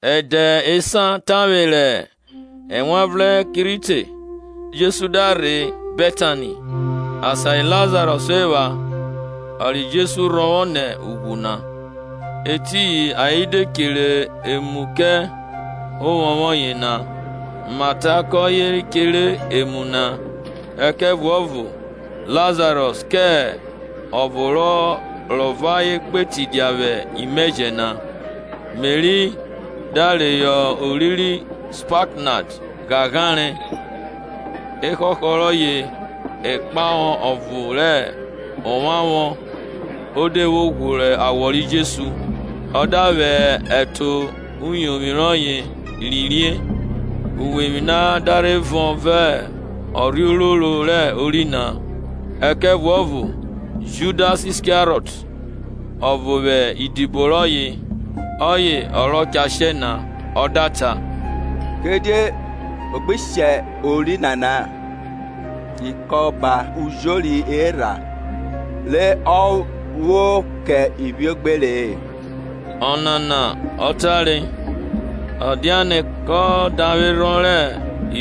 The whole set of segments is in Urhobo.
Ẹdẹ esan tavwe rẹ Ewanvrẹn ki rhi te, Jesu da rhe Betani, asan ri Lazarọs epha, ọ ri Jesu rhọvwọ nẹ ughwu na. Etiyin ayen de chere emu kẹ vwẹ ovwọnvwọn yena; Mata kọye chere emu na, ẹkẹvuọvo Lazarọs kẹ ọvo rọ vẹ ayen gbe tidia vwẹ imẹjẹ na. Meri da reyọ ori ri spaknad ghaghare ẹhọhọ rọye ikpahọ ọvo rẹ ovwavwọn o de vwo ghworo awọ ri Jesu ọ da vwẹ ẹto rẹ uyovwi rọye rhie; uwevwi na da rhe vọn vẹ ọnrhe ororo rẹ ori na. Ẹkẹvuọvo Judas Iskariọt, ọvo vwẹ idibo rọye (ọye ọ rọ cha shẹ na), ọ da ta, Kidie a gbe shẹ ori nana ikọba ujori erha re a vwọ kẹ ivwiogbere-e? Ọnana ọ tare, ọ dianẹ kọ davwerhọn rẹ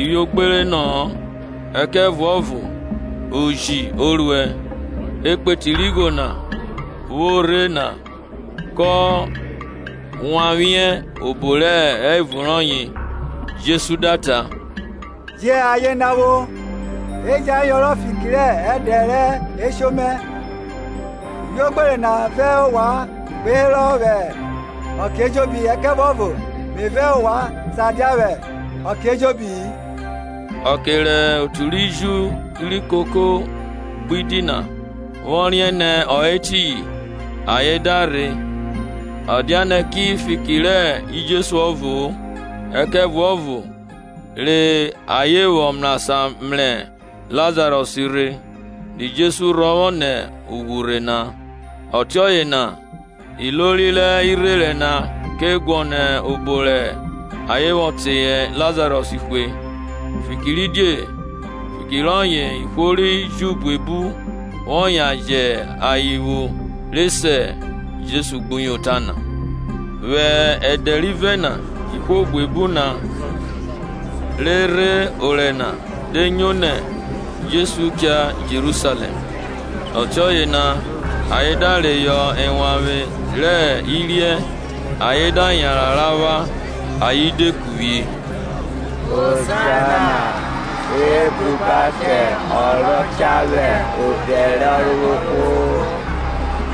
ivwiogbere na-a, ẹkẹvuọvo oji o ruẹ, ekpeti rẹ igho na vwo rhe na kọ wanvwiẹ obo re hẹ evun rọye. Jesu da ta, Jẹn aye na vwo, e jẹn ọ yọnrọn fiki rẹ ẹdẹ rẹ esho mẹ. Ivwiogbere na vẹ ovwan gba herọ vwẹ ọke ejobi, ẹkẹvuọvo me vẹ ovwan sa dia vwẹ ọke ejobi-i. Ọke rẹ otu ri Ju ri kokori gbidi na vwọ riẹn nẹ ọ hẹ etiyin, ayen da rhe, ọ dianẹ ki fiki rẹ Jesu ọvo-o ẹkẹvuọvo re ayen vwọ mrasan mrẹ Lazarọs rhe, ri Jesu rhọvwọ nẹ ughwu rhe na. Ọtiọye na ilori rẹ irherẹn na ke guọnọ obo rẹ ayen vwọ teye Lazarọs hwe, fikiridie, oma rọye ọye ihwo ri Ju buebu vwọ yan jẹ ayen vwo re se Jesu gbuyota na. Vwẹ ẹdẹ rivẹ na ihwo buebu na re rhe orẹ na de nyo nẹ Jesu cha Jerusalẹm. Ọtiọye na ayen da reyọ ewanvwe rẹ iriẹ ayen da yanran ra vwa, ayen de kuvwie, Hozana, Ebruba kẹ ọ rọ cha vwẹ odẹ rẹ Ọrovowhwo,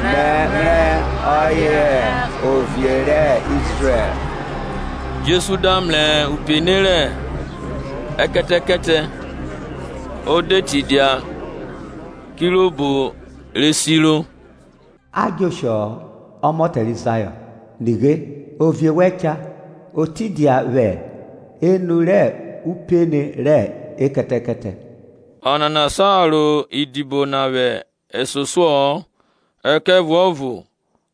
mrẹmrẹ ọye hẹ Ovie rẹ Izrẹl. Jesu da mrẹ upene rẹ ekẹtẹkẹtẹ o de tidia; kirobo re siro, A djẹ oshọ-ọ, ọmọtẹ ri Zayọn; nighe, ovie wẹn cha, o tidia vwẹ enu rẹ upene rẹ ekẹtẹkẹtẹ. Ọnana sa ro idibo na vwẹ ẹsosuọ-ọ; ẹkẹvuọvo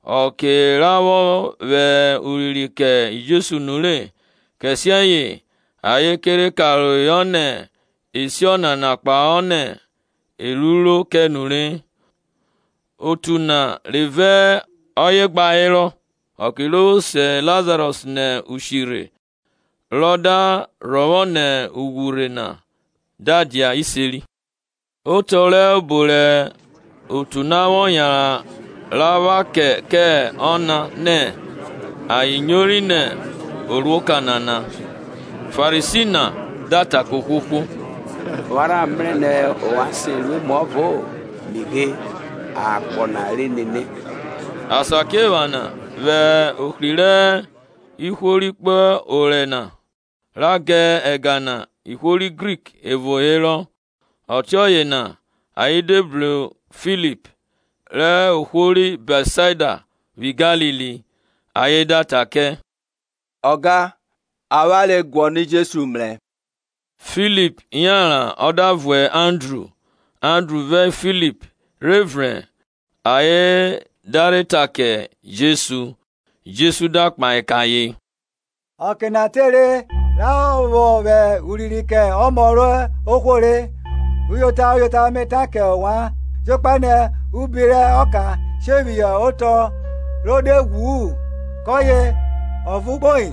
ọke ra vwọ vwẹ urinrin kẹ Jesu nu, kẹsiẹye ayen ke rhe karohọ nẹ e si ọnana kpahọ nẹ e ruro kẹ nure. Otu na re vẹ ọye gba herọ vwẹ ọke ro vwo se Lazarọs nẹ ushi rhe rọ da rhọvwọ nẹ ughwu rhe na da dia iseri. Otọ rẹ obo rẹ otu na vwọ yan bro ra kẹ ọna nẹ ayen nyori nẹ o ru emu rẹ igbunu nana. Farisi na da ta kẹ ohwohwo, Ovwan rha mrẹ nẹ ovwan se ru emuọvo-o; nighe, akpọ na re nene. Asakiephana vwẹ ohri rẹ ihwo ri kpo orẹ na ra ga ẹga na ihwo ri Grik evo herọ. Ọtiọye na ayen de bru Filip, rẹ ohwo ri Bẹtsaida vwi Galili, ayen da ta kẹ, Ọga, avwanre guọnọ Jesu mrẹ. Filip yanran ọ da vuẹ Andru; Andru vẹ Filip rhe vrẹn ayen da rhe ta kẹ Jesu. Jesu da kpahe kẹ ayen, Ọke na tere ra vwọ vwẹ urinrin kẹ Ọmọ rẹ ohwo re. Uyota, uyota, me ta kẹ ovwan, jokpa nẹ ubi rẹ ọka she phihọ otọ ro de ghwu-u, kọye ọvo kpoi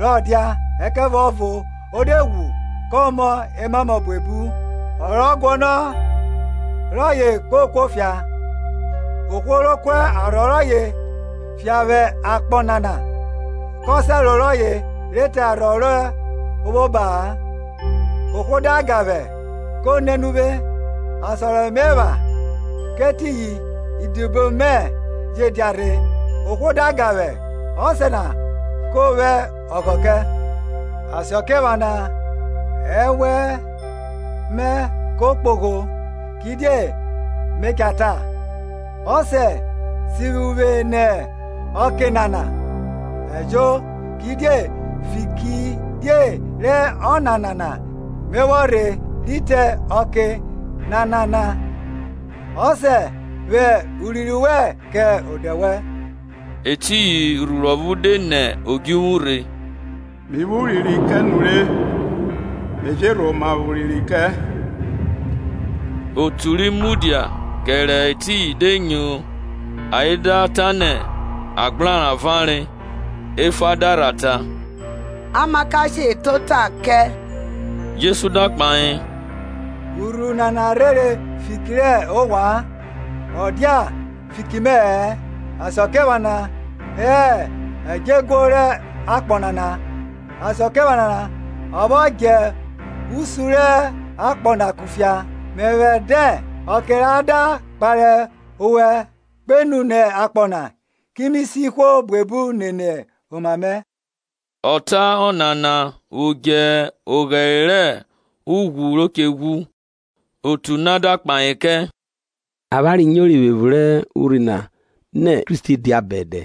re dia; ẹkẹvuọvo o de ghwu, kọ mọ emamọ buebu. Ọ rọ guọnọ rọye ko kuofia; ohwo ro ku arhọ rọye fia vwẹ akpọ nana kọ sẹro rọye re te arhọ ro vwo oba-a. Ohwo da ga vwẹ, ko nene uvwe; asan re me epha, kẹ etiyin idibo mẹ je dia rhe; ohwo da ga vwẹ, Ọsẹ na kọ vwẹ ọghọ kẹ. Asakiephana ẹnwẹ mẹ ko kpogho. Kidie me cha ta, Ọsẹ, sivwi uvwe nẹ ọke nana? Ejo, kidie fiki rẹ ọnana na me vwọ rhe rhi te ọke nana na. Ọsẹ, vwẹ urinrin kẹ odẹ wẹn. Etiyin urhuru ọvo de nẹ odjuvwu rhe, me vwẹ urinrin kẹ nure, me je rhoma vwẹ urinrin kẹ. Otu ri mudia kẹrẹ etiyin de nyo ayen da ta nẹ agbrara vare. Efa da rha ta, Amakashe ta ota kẹ. Jesu da kpahe, Urhuru nana rhere fiki rẹ ovwan, ọ dia fiki mẹ-ẹ. Asakiephana hẹ ẹdjọeguo rẹ akpọ nana, asakiephana a vwọ djẹ osun rẹ akpọ na kufia, mẹvwẹ dẹn, ọke ra da kpare ovwẹ kpenu nẹ akpọ na, ki mi si ihwo buebu nene oma mẹ. Ọ ta ọnana vwo dje oghẹre rẹ ughwu ro che ghwu. Otu na da kpahe kẹ, Avwanre nyori vwẹ evun rẹ urhi na nẹ Kristi dia bẹdẹ.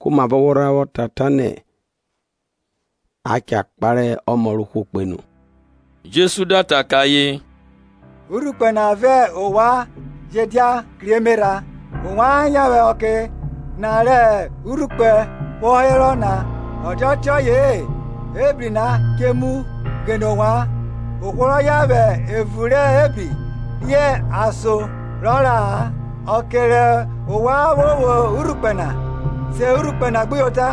Komavọ wọ rha vwọ ta nẹ a cha kpare Ọmọ rẹ ohwo kpenu? Jesu da ta kẹ ayen, Urhukpẹ na vẹ ovwan je dia kri emerha. Ovwan yan vwẹ ọke na rẹ urhukpẹ vwọ herọ na; ọ dia ọtiọye-e ebri na che muẹ ghene ovwan; ohwo rọ yan vwẹ evun rẹ ebri riẹn asan rọ ra-a. Ọke rẹ ovwan vwo vwo urhukpẹ na, se urhukpẹ na gbuyota,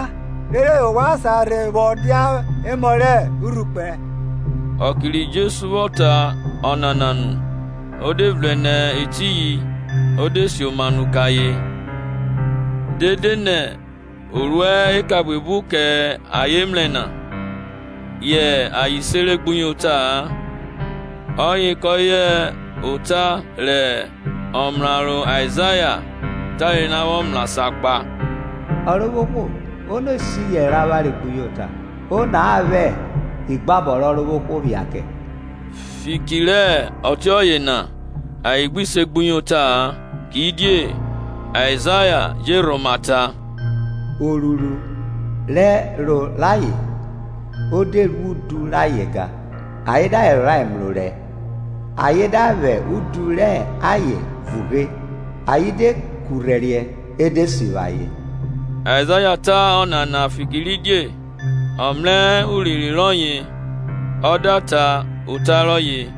rere ovwan sa rhe vwọ dia emọ rẹ urhukpẹ. Ijesegbuyota rẹ Ihwo ri Ju Ọke ri Jesu vwọ ta ọnana nu, ọ de vrẹn nẹ etiyin o de sioma nu kẹ ayen. Dede nẹ o ru eka buebu kẹ ayen mrẹ na, yẹ ayen sere gbuyota-a; ọye kọye ota rẹ omraro Aizaya tare na vwọ mrasan gba; Ọrovwohwo, ono ri se iyẹnrẹ rẹ avwanre gbuyota, ono a vwẹ igbabọ rẹ Ọrovwohwo phia kẹ? Fiki rẹ ọtiọye na ayen gbi se segbuyota-a. Kidie Aizaya je rhoma ta. Orhurhu ẹro rayen o de ru udu rayen gan, ayen da vwẹ ẹro rayen mrẹ orẹ ayen da vwẹ udu rẹ ayen vughe, ayen de kurhẹriẹ e de sivwi ayen. Aizaya ta ọnana fikiridie ọ mrẹ urinrin rọye ọ da ta ota kpahọ.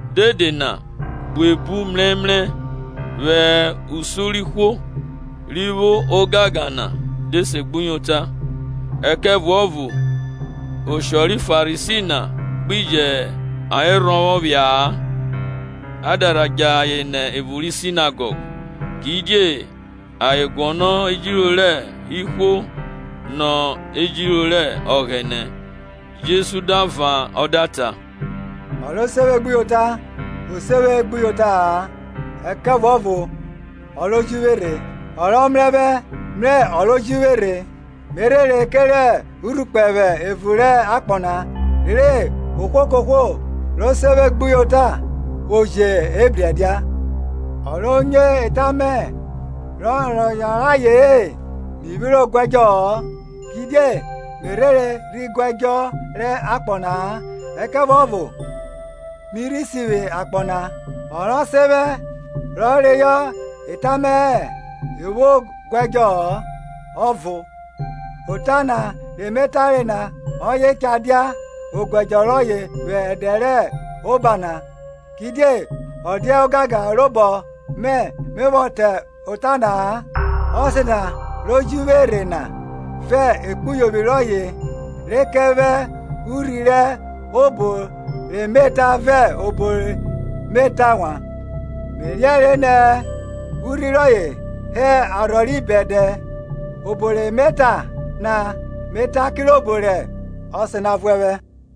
Dede na buebu mrẹmrẹ vwẹ usun rẹ ihwo ri vwo ogangan na de segbuyota, ẹkẹvuọvo oshọ ri Farisi na gbi jẹ ayen rhọvwọ phia-a, a da rha djẹ ayen nẹ evun ri Sinegọg; kidie ayen guọnọ ejiro rẹ ihwo nọ ejiro rẹ Ọghẹnẹ. Jesu da van ọ da ta, Ọ ro se vwe gbuyota, o se vwe gbuyota-a ẹkẹvuọvo ọ ro ji vwe rhe. Ọ rọ mrẹ vwẹ jọ mrẹ ọ ro ju vwe rhe. Me rhere kerẹ urhukpẹ vwẹ evun rẹ akpọ na, rere ohwo kohwo ro se vwe gbuyota vwo jẹ ebri ẹdia. Ohwo ro nyo eta mẹ rọ yọnrọn aye-en, mi vwiro guẹdjọ-ọ; kidie me rhere rhi guẹdjọ rẹ akpọ na-a ẹkẹvuọvo mi rhi sivwi akpọ na. Ọ rọ sen vwẹ rọ reyọ eta mẹ-ẹ o vwo oguẹdjọ ọvo; ota na re me tare na ọye cha dia oguẹdjọ rọye vwẹ ẹdẹ rẹ obo oba na. Kidie ọ dia ogangan robọ mẹ me vwọ ta ota na-a; Ọsẹ na ro ji vwe na vẹ ekpuyovwi rọye re kẹ vwẹ urhi rẹ obo re me ta vẹ obo re me ta wan. Me riẹnre nẹ urhi rọye hẹ arhọ ri bẹdẹ. Obo re me ta na, me ta kirobo rẹ Ọsẹ na vuẹ vwẹ.